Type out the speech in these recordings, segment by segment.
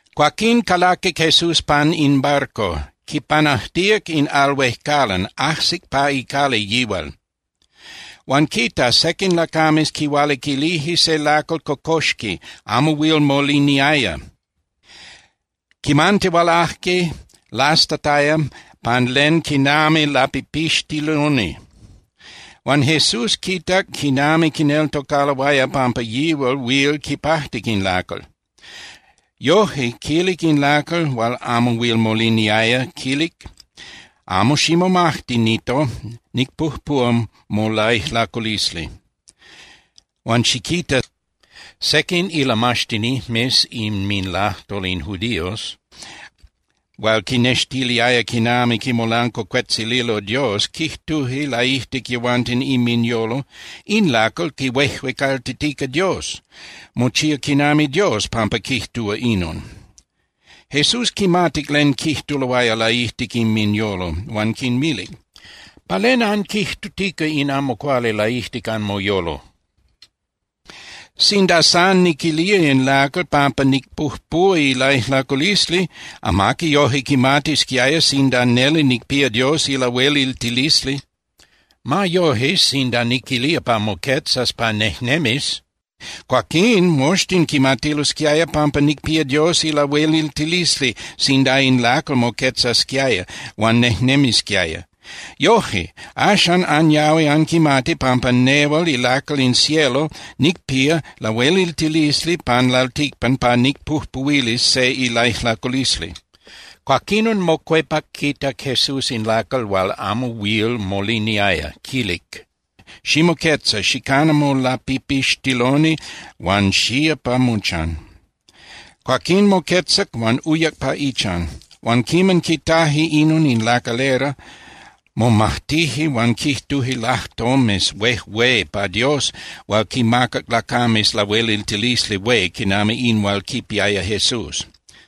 Cuaquín calaquic Jesús pan in barco, quipanajtíac in al huejcalan, ajsic pa icali yihual. Huan quita, sequin lacames quihualiquilije se lacal cocoxquil, amo huil moliniaya. Quimantihualaje lastataya pan len quinami lapipixtiloni. Huan Jesús quitac quinami quineltocaloaya pampa yihual huil quipajtic in lacal. Yoje, quilic in lacal hual amo huil moliniaya, quilic: —Amo ximomajti, Nito, nicpujpúa molaijlaculisli. Huan xiquita, sequin ilamaxtinijmes inminlajtol in judíos hual quinnextilía quinami quimolancuacuetzililo Dios quijtuje laijtic yehuanten inminyolo: —In lacal quihuejuecaltitica Dios. Mochía quinami Dios pampa quijtúa inon. Jesús quimatic len quijtuloaya laijtic inminyolo huan quinmilic: —¿Pa len anquijtutica in amo cuali laijtic anmoyolo? Sinda san niquilía in lacal pampa nicpujpuhua ilaijlaculisli, amaqui yoje quimatisquiaya sinda neli nicpía Dios ilahueliltilisli. Ma yoje, sinda niquilía pa moquetzas pa nejnemis, cuaquín moxtin quimatilosquiaya pampa nicpía Dios ilahueliltilisli sinda in lacal moquetzasquiaya huan nejnemisquiaya. Yoje, axan anyahui anquimati pampa nehual ilacal in cielo nicpía lahueliltilisli pan lalticpan pa nicpujpuhuilis se ilaijlaculisli. Cuaquinon mocuepac quitac Jesús in lacal hual amo huil moliniaya, quilic: —Ximoquetza, xicana molapipixtiloni huan xía pa mochan. Cuaquín moquetzac huan uyac pa ichan. Huan quiman quitaje inon in lacalera, momajtije huan quijtuje lajtomes huejué pa Dios hual quinmacac lacames lahueliltilisli hué quinami in hual quipiaya Jesús.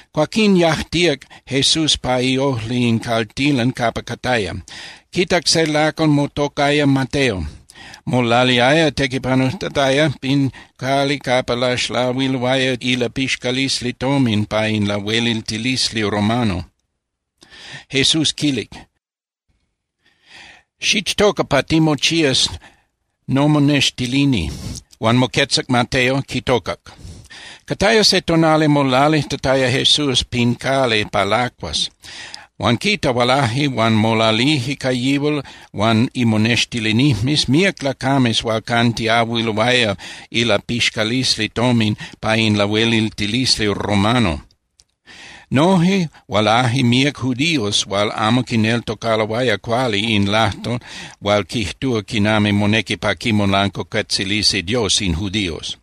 Cuaquín yajtíac Jesús pa iojli in caltilan capa cataya, quitac se lacal motocaya Mateo. Molaliaya tequipanujtataya pin cali capa laxlahuiloaya ilapixcalisli tomin pa in lahueliltilisli romano. Jesús quilic: —Xichtoca pa timochías nomonextilini. Huan moquetzac Mateo, quitocac. Cataya se tonali molalijtataya Jesús pin cali pa lacuas, huan quita, hualaje huan molalije ca yihual huan imonextilinijmes míac lacames hual cantiahuiloaya ilapixcalisli tomin pa in lahueliltilisli romano. Noje hualaje míac judíos hual amo quineltocaloaya cuali in lajtol hual quijtúa quinami monequi pa quimolancuacuetzilisi Dios in judíos.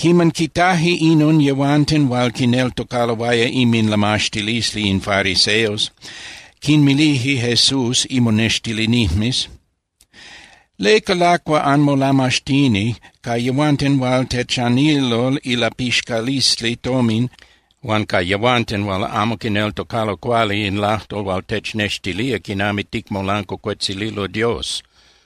Quiman quitaje inon yehuanten hual quineltocaloaya inminlamaxtilisli in fariseos, quinmilije Jesús imonextilinijmes: —¿Leca lacua anmolamaxtini ca yehuanten hual techanililo ilapixcalisli tomin huan ca yehuanten hual amo quineltocalo cuali in lajtol hual technextilía quinami ticmolancuacuetzililo Dios?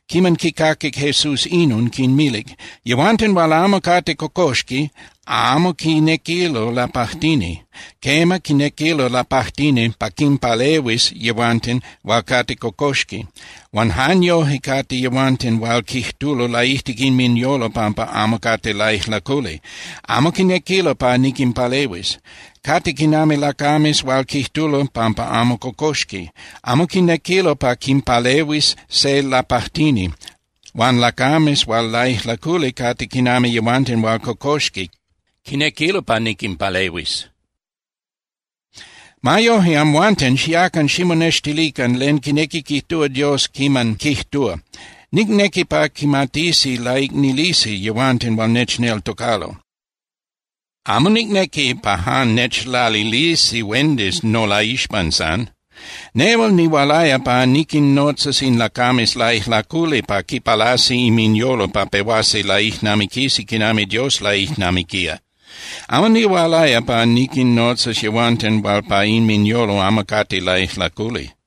Quiman quicaquic Jesús inon, quinmilic: —Yehuanten hual amo cate cocoxqui amo quinequilo lapajtini. Quema, quinequilo lapajtini pa quinpalehuis yehuanten hual cate cocoxqui. Huan jan yoje cate yehuanten hual quijtulo laijtic inminyolo pampa amo cate laijlaculi. Amo quinequilo pa niquinpalehuis. Cate quinami lacames hual quijtulo pampa amo cocoxqui. Amo quinequilo pa quinpalehuis se lapajtini. Huan lacames hual laijlaculi cate quinami yehuanten hual cocoxqui, quinequilo pa niquinpalehuis. Ma yoje, amhuanten, xiacan ximonextilican len quinequi quijtúa Dios quiman quijtúa: “Nicnequi pa quimatisi laicnilisi yehuanten hual nechneltocalo. Amo nicnequi pa jan nechlalilisi huendis nolaixpan san.” Nehual nihualaya pa niquinnotzas in lacames laijlaculi pa quipalasi inminyolo pa pehuasi laijnamiquisi quinami Dios laijnamiquía. Amo nihualaya pa niquinnotzas yehuanten hual pa inminyolo amo cate laijlaculi.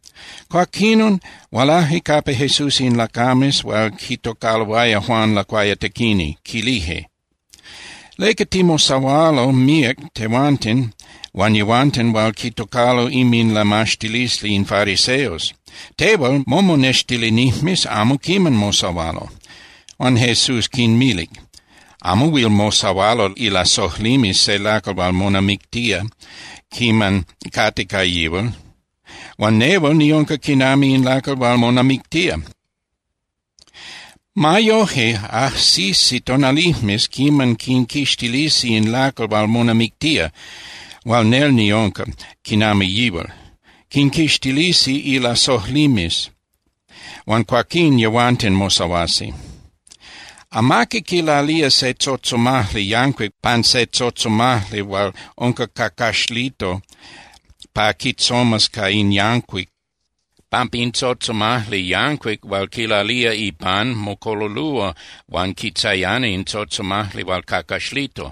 Cuaquinon hualaje capa Jesús in lacames hual quitocaloaya Juan Lacuayatequini, quilije: —¿Leca timosahualo míac tehuanten huan yehuanten hual quitocalo inminlamaxtilisli in fariseos? Tehual momonextilinijmes amo quiman mosahualo. Huan Jesús quinmilic: —Amo huil mosahualo ilasojlimes se lacal hual monamictía quiman cate ca yihual. Huan nehual niunca quinami in lacal hual monamictía. Ma yoje, ajsisi tonalijmes quiman quinquixtilisi in lacal hual monamictía hual nel niunca quinami yihual. Quinquixtilisi ilasojlimes, huan cuaquín yehuanten mosahuasi. ’Amaqui quilalía se tzotzomajli yancuic pan se tzotzomajli hual unca cacaxlito pa quitzomas ca in yancuic, pampa in tzotzomajli yancuic hual quilalía ipan mocololúa huan quitzayana in tzotzomajli hual cacaxlito.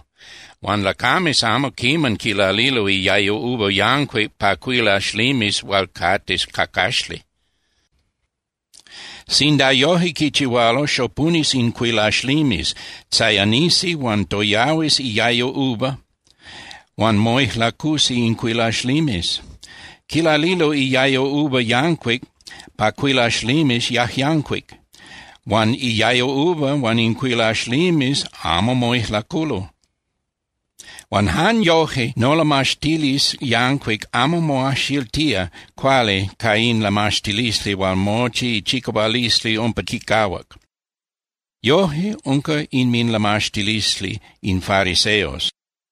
Huan lacames amo quiman quilalilo iayo uva yancuic pa cuilaxlimes hual cate cacaxli. Sinda yoje quichihualo, xopunis in cuilaxlimes, tzayanisi huan toyahuis iayo uva huan moijlacusi in cuilaxlimes. Quilalilo iayo uva yancuic pa cuilaxlimes yajyancuic, huan iayo uva huan in cuilaxlimes amo moijlaculo. Huan jan yoje nolamaxtilisli yancuic amo moajxiltía cuali ca in lamaxtilisli hual mochi ichicahualisli umpa quicahuac. Yoje unca inminlamaxtilisli in fariseos.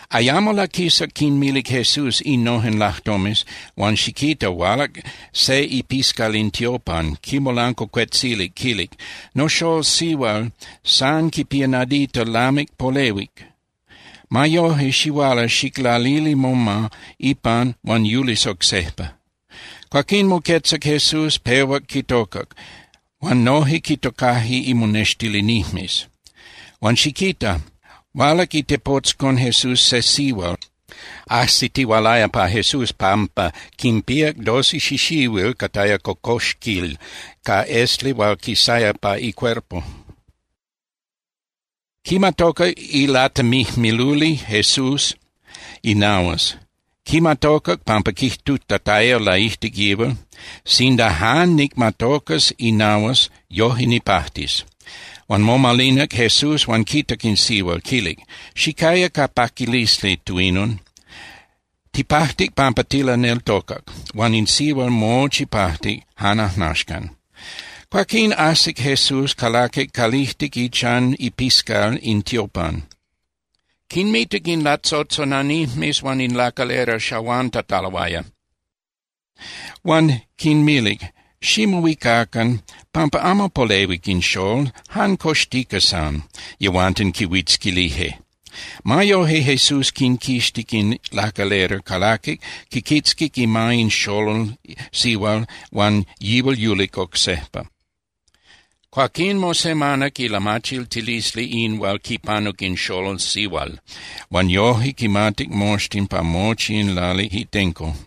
Ayamo laquisac quinmilic Jesús innojen lajtomes, huan xiquita, hualac se ipiscal in tiopan, quimolancuacuetzilic, quilic: —Noxól sihual san quipía nadita lamic polehuic. Ma yoje xihuala xiclalili moma ipan huan yulis oc sejpa. Cuaquín moquetzac Jesús, pehuac quitocac, huan noje quitocaje imonextilinijmes. Huan xiquita, hualac itepotzcon Jesús se sihual, ajsitihualaya pa Jesús pampa quinpíac doce xixihuil cataya cocoxquil ca esli hual quisaya pa icuerpo. Quimatocac ilatemijmiluli Jesús inahuas. Quimatocac pampa quijtutataya laijtic yihual: “Sinda jan nicmatocas inahuas, yoje nipajtis.” Huan momalinac Jesús huan quitac in sihual, quilic: —Xicaya ca paquilisli, Tuinon. Tipajtic pampa tilaneltocac. Huan in sihual mochi pajtic jan ajnaxcan. Cuaquín ajsic Jesús, calaquic calijtic ichan ipiscal in tiopan. Quinmitac in latzotzonanijmes huan in lacalera xahuantataloaya. Huan quinmilic: —Ximohuicacan, pampa amo polehuic in xól, jan coxtica san. Yehuanten quihuitzquilije. Ma yoje Jesús quinquixtic in lacalera, calaquic, quiquitzquic ima in xolol sihual huan yihual yulic oc sejpa. Cuaquín mosemanac ilamachiltilisli in hual quipanuc in xolol sihual, huan yoje quimatic moxtin pa mochi in lali itenco.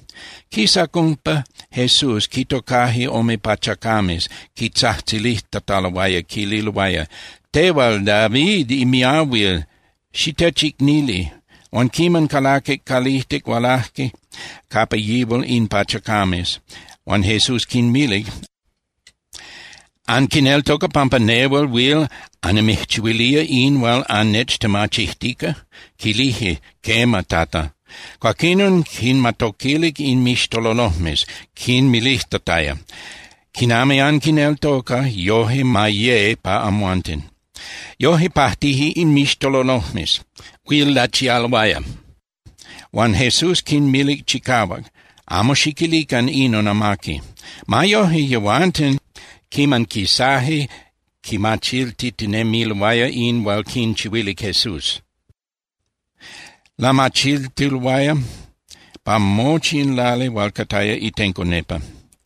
Quisac umpa Jesús, quitocaje ome pachacames, quitzajtzilijtataloaya, quililoaya: —Tehual David imiahuil, ¡xitechicnili! Huan quiman calaquic calijtic, hualaje capa yihual in pachacames, huan Jesús quinmilic: —¿Anquineltoca pampa nehual huil annimijchihuilía in hual annechtemachijtica? Quilije: —Quema, Tata. Cuaquinon quinmatoquilic inmixtololojmes, quinmilijtataya: —Quinami anquineltoca, yoje ma ye pa amhuanten. Yoje pajtije inmixtololojmes, huil lachialoaya. Huan Jesús quinmilic chicahuac: —Amo xiquilican inon amaqui. Ma yoje, yehuanten, quiman quisaje, quimachiltitinemiloaya in hual quinchihuilic Jesús. Lamachiltiloaya pa mochi in lali hual cataya itenco nepa.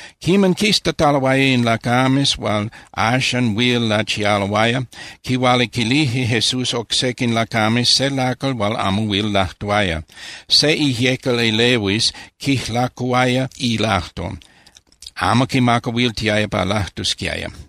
Quiman quistataloaya in lacames hual axan huil lachialoaya, quihualiquilije Jesús oc sequin lacames se lacal hual amo huil lajtuaya. Se ijyecal elehuis quijlacuhuaya ilajtol, amo quimacahuiltiaya pa lajtusquiaya.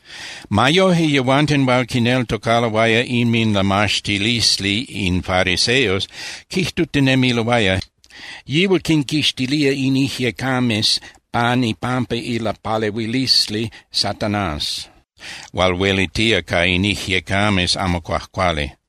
Ma yoje, yehuanten hual quineltocaloaya inminlamaxtilisli in fariseos quijtutinemiloaya: —Yihual quinquixtilía in ijyecames pan ipampa ilapalehuilisli Satanás hual huelitía ca in ijyecames amo cuajcuali.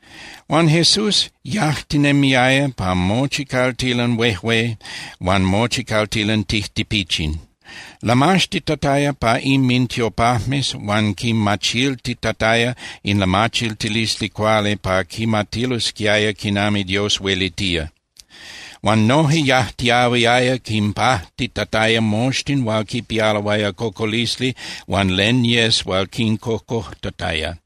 Huan Jesús yajtinemiaya pa mochi caltilan huejué huan mochi caltilan tijtipichin. Lamaxtitataya pa inmintiopajmes huan quimachiltitataya in lamachiltilisli cuali pa quimatilosquiaya quinami Dios huelitía. Huan noje yajtiahuiaya quinpajtitataya moxtin hual quipialoaya cocolisli huan len yes hual quincocojtataya.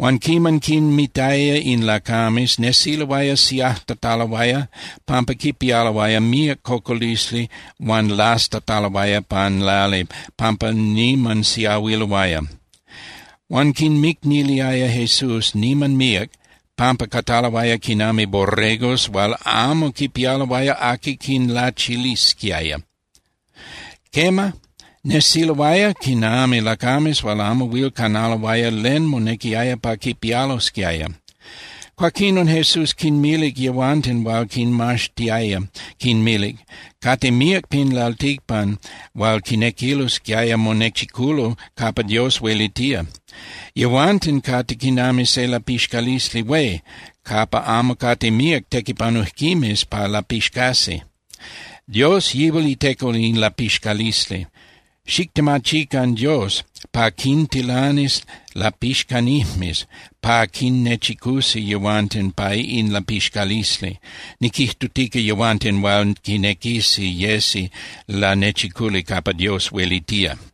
Huan quiman quinmitaya in lacames, nesiloaya siajtataloaya pampa quipialoaya míac cocolisli huan lastataloaya pan lali pampa niman siahuiloaya. Huan quinmicniliaya Jesús niman míac pampa cataloaya quinami borregos hual amo quipialoaya aqui quinlachilisquiaya. Quema, nesiloaya quinami lacames hual amo huil canaloaya len monequiaya pa quipialosquiaya. Cuaquinon Jesús quinmilic yehuanten hual quinmaxtiaya, quinmilic: —Cate míac pin lalticpan hual quinequilosquiaya monechiculo capa Dios huelitía. Yehuanten cate quinami se lapixcalisli hué capa amo cate míac tequipanujquimes pa lapixcasi. Dios Yihual iteco in lapixcalisli. Xictemachican Dios pa quintilanis lapixcanijmes pa quinnechicusi yehuanten pa in lapixcalisli, niquijtutica yehuanten hual quinequisi yesi lanechiculi capa Dios huelitía.